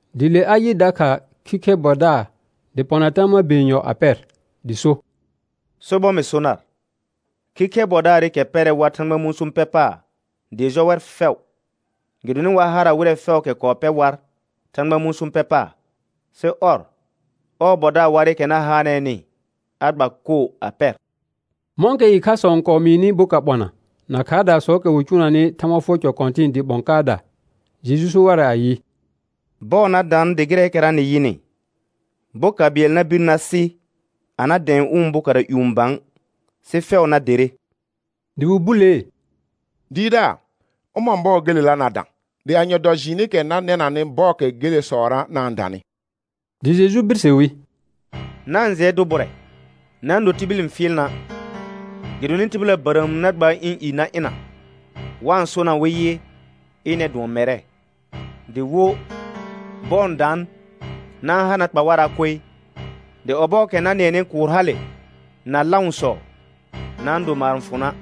Dɩ le a yɩ dakha khikhɛr bɔdaar dɩ pɔna tama be yenyɔ a pɛr. Dɩ so: Sobɔr mɩ so nar, khikhɛr bɔdaarɩkɛ pɛrɛ war Thãgba mũsũ pɛ paar dɩɩ jɔ wɛr fɛʋ. Gɩdonɩ war harra wɩrɛ fɛʋʋkɛ kɔɔ pɛr war Thãgba mũsũ pɛ paar, sɩ ɔr, ɔɔ bɔdaar warɩkɛ na haanɛɛnɩ a gba koo a pɛr. Mɔ̃kɛ ɩkhasɔ n kɔɔ mɩɩnɩ boka ɓɔna na khaardaasɔɔkɛ wɩ cʋʋnanɩ Thãgba fʋɔr cɔ kɔ̃tɩ̃ɩ dɩɩ ɓɔ̃ kaada, Jeju so warɛ ayɩ: Bɔɔ na daan dɩ gɩrɛɛkɛra nɩ yɩnɩ, boka bɩɛl na bir na sɩ a na dɛ̃ɛ ʋ̃ bokara ƴũ bã, sɩ fɛʋ na derre. Dɩ wɩ bulee: Dɩɩrdaar, ʋmɔ̃ bɔɔ gelela na dã? Dɩ anye dɔ jɩɩnɩkɛ na nɛnanɩ bɔɔkɛ gelesɔra na-n danɩ? Dɩ Jeju birse wi: Na-n jɩɛ dʋ bʋrɛ, na-n do tibil n fɩɩl na', gɩdonɩ tɩbɩla bərəəm na gbaar ɩ̃ i na ɩna wa-n sona wɩ yɩ, ɩnɛr dʋɔn mɛrɛ; dɩ wo, bɔɔ n daan. Na-n ha na kpa wara' koe. Dɩ ɔbɔɔkɛ na nɩɛnɩ kʋʋr hale na lãʋsɔ, na-n do maar n fʋ na',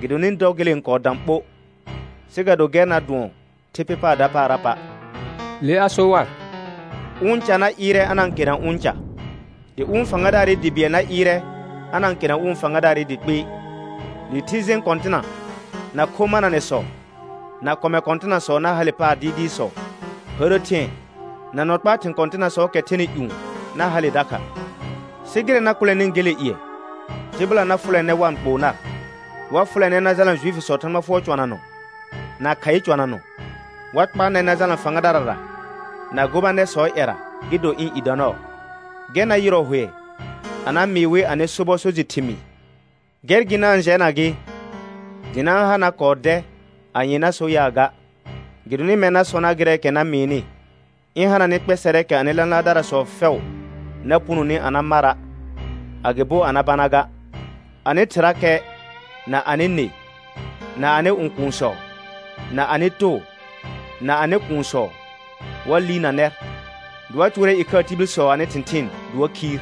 gɩdonɩ dɔ gele n kɔɔ dã ɓo, sɩ ga do gɛr na dʋɔn thɩ pɩ paar dapaara pa'. Le a so war: Ʋ ca na ɩɩrɛ a na-n khena ʋ̃ ca, dɩ ʋ̃ fãgadaarɩ dɩ bɩɛl na ɩɩrɛ a na-n kena ʋ̃ fãgadaarɩ dɩ kpɩɩ. Dɩ thɩ jẽ kɔ̃tɩna, na kho mananɛsɔ, na kɔmɛ kɔ̃tɩnasɔ na hale paar dɩɩdɩɩsɔ. Hərə thɩ̃ɛ na nɔ kpaa thɩ̃ kɔ̃tɩnasɔɔkɛ thɛnɩ ƴũ na hale dakha. Sɩ gɩrɛ na kʋlɛnɩ gele ƴɩɛ, tɩbɩla na fʋlɛ nɛr wa-n kpoo nar. Wa fʋlɛ nɛr na jalna Juifisɔɔ Thãgba fʋɔr cɔnanɔ na khaɩ cɔnanɔ. Wa kpa nɛr na jalna fãgadarara na gobanɛrsɔɔ ƴɛra, gɩ do ɩ̃ i dɔ nɔɔ. Gɛr na yɩrɔ hʋɛ a na mɩɩ wɩ anɩ sobɔ so jɩ thɩmɩɩ. Gɛr gɩ na-n jɛna gɩ dɩ na-n ha na kɔɔ dɛ anye na so yaa ga. Gɩdonɩ mɛr na sɔ nar gɩrɛɛkɛ na mɩɩnɩ, ɩ̃ hana nɩ kpɛsɛrɛɛkɛ anɩ lãlaardarasɔ fɛʋ na punoni a na mara', agɩbo a na bana ga. Anɩ thɩrakɛ, na anɩ nɩ, na anɩ õkuunsɔ, na anɩ too, na anɩ kuunsɔ, wa liirna nɛr, dɩ wa cʋʋrɛ ɩkhaa tibilsɔ anɩ thɩ̃thɩɩn dɩ wa khiir.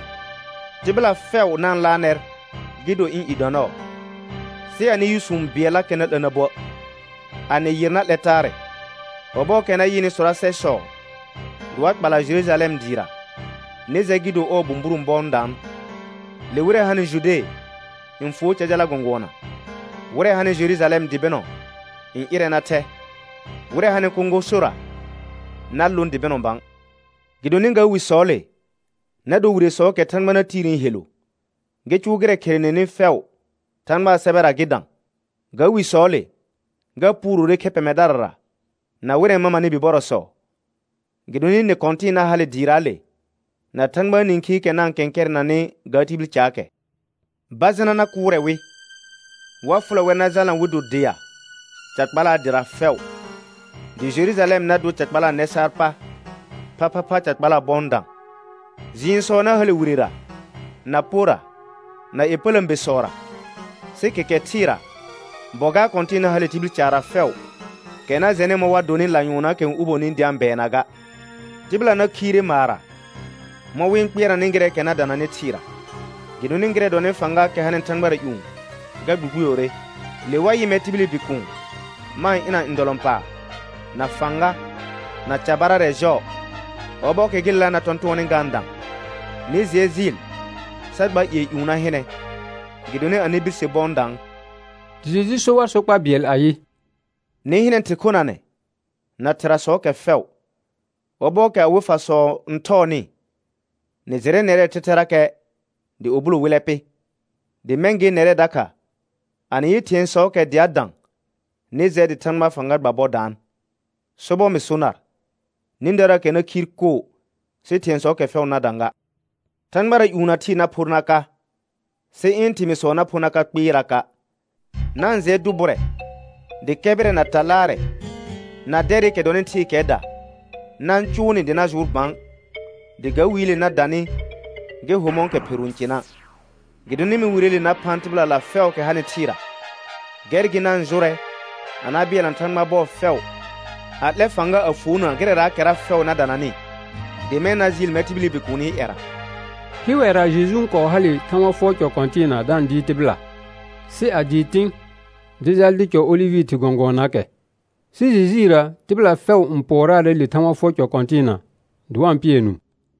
Tɩbɩla fɛʋ na-n laar nɛr gɩ do ɩ̃ i dɔ nɔɔ. Sɩ anɩ yʋsũ bɩɛllakɛ na 'la na buə'. A nɩ yɩr, na 'lɛr taarɛ. Ɔbɔɔkɛ na yɩnɩ sɔrasɛsɔ dɩ wa kpala Jerujalɛm dɩɩra, nɩ jɛ gɩ do ɔɔ bũburõ bɔ n daan. Le wɩrɛ hanɩ Jude n fuo ca jala gɔ̃gʋɔna, wɩrɛ hanɩ Jerujalɛm dɩ bɩnɔ n ɩrɛ na thɛ, wɩrɛ hanɩ kõgosora na lõ dɩ bɩnɔ bã. Gɩdonɩ ga wisɔɔle na do wiresɔɔkɛ Thãgba na tiirni helu, gɩ cʋʋ gɩrɛ kherenenɩ fɛʋ Thãgbaa sɛbɛra gɩ dã. Ga wisɔɔle, ga puurore khɛ pɛmɛdarara na wɩrɛ n mamanɩ bibɔrɔsɔ. Gɩdonɩ nɩ kɔ̃tɩ̃ɩ na hale dɩɩraale na Thãgbaa nĩkhiikɛ na-n kɛ̃kɛrɛnɛnanɩ ga tibil caakɛ. Bajɩna na kʋʋrɛ wɩ, wa fʋlɛ wɛr na jalna wɩ do dea ca kpalaa dɩra fɛʋ, dɩ Jerujalɛm na dor ca kpalaa nɛ saar pa phaphapha ca kpalaa bɔ n dã. Jɩɩnsɔ na hale wirera na porra na ƴepələ̃besɔra; sɩ kɛkɛ thɩɩra bɔ gaar kɔ̃tɩ̃ɩ na hale tibil caarra fɛʋ, kɛ na jɛnɩ mɔ̃ wa donɩ lanyʋɔnnaakɛ n uboni dɩ a-n bɛɛna ga. Tɩbɩla na khiire maarra mɔ̃ wɩ-n kpɩɛrnanɩ gɩrɛɛkɛ na dananɩ thɩɩra, gɩdonɩ gɩrɛ dɔnɩ fãgaakɛ hanɩ thãgbara ƴũ ga gbugbuyore. Le wa yɩ mɛr tibili Bikuun ma-n ɩna ndɔlɔ̃paar, na fãga, na carbarɛ jɔɔ. Ɔbɔɔkɛ gelela na tɔ̃tʋɔnnɩ ga-n dã, nɩ jɩɛ jɩɩl sa gba ƴɩɛ ƴũ na hɩnɛ, gɩdonɩ anɩ birse bɔ n daan. Dɩ Jeju so war sokpa bɩɛl ayɩ: Nɩ hɩnɛ thɩr khonanɛ na thɩrasɔɔkɛ fɛʋ. Ɔbɔɔkɛ awɩ fasɔ n thɔɔnɩ, nɩ jɩrɛ nɛrɛɛ thɛthɛrakɛ dɩ ubulo wɩllɛ pɩ. Dɩ mɛ̃ gɩ nɛrɛ dakha, a nɩ yɩ thɩ̃ɛsɔɔkɛ dɩ a dã, nɩ jɛ dɩ Thãgbaa fãga gba bɔ daan. Sobɔr mɩ so nar, nĩdaraakɛ na khiir koo sɩ thɩ̃ɛsɔɔkɛ fɛʋ na dã ga. Thãgbara ƴũ na thɩɩ na phor na ka, sɩ ɩ̃ thɩmɩɩsɔ na pho na ka kpɩɩraka'. Na-n jɩɛ dʋ bʋrɛ, dɩ kɛbɩrɛ, na ta laarɛ, na dɛrɩkɛ dɔnɩ thɩɩkɛɛda na-n cʋʋ nɩ dɩ na jʋʋr bã, dɩ ga wiile na danɩ gɩ ho mɔ̃kɛ pheru n cɩna'. Gɩdonɩ mɛ̃ wireele na phã tɩbɩlala fɛʋʋkɛ hanɩ thɩɩra. Gɛr gɩ na-n jʋrɛ a na bɩɛlna Thãgba bɔɔ fɛʋ, a 'lɛ fãga a fuona gɩrɛraakɛra fɛʋ na dananɩ, dɩ mɛ̃ na jɩɩl mɛr tibili Bikuuni ƴɛra. Hɩwɛra Jeju n kɔɔ hale Thãgba fʋɔr cɔ kɔ̃tɩɩna da-n dɩɩr tɩbɩla, sɩ a dɩɩ tɩ̃, dɩ jal dɩ cɔ olɩvɩ thɩr gɔ̃gʋɔnaakɛ. Sɩ jijiirə tɩbɩla fɛʋ n pʋɔraarɛ le Thãgba fʋɔr cɔ kɔ̃tɩɩna, dɩ wa-n pɩɛ nũu.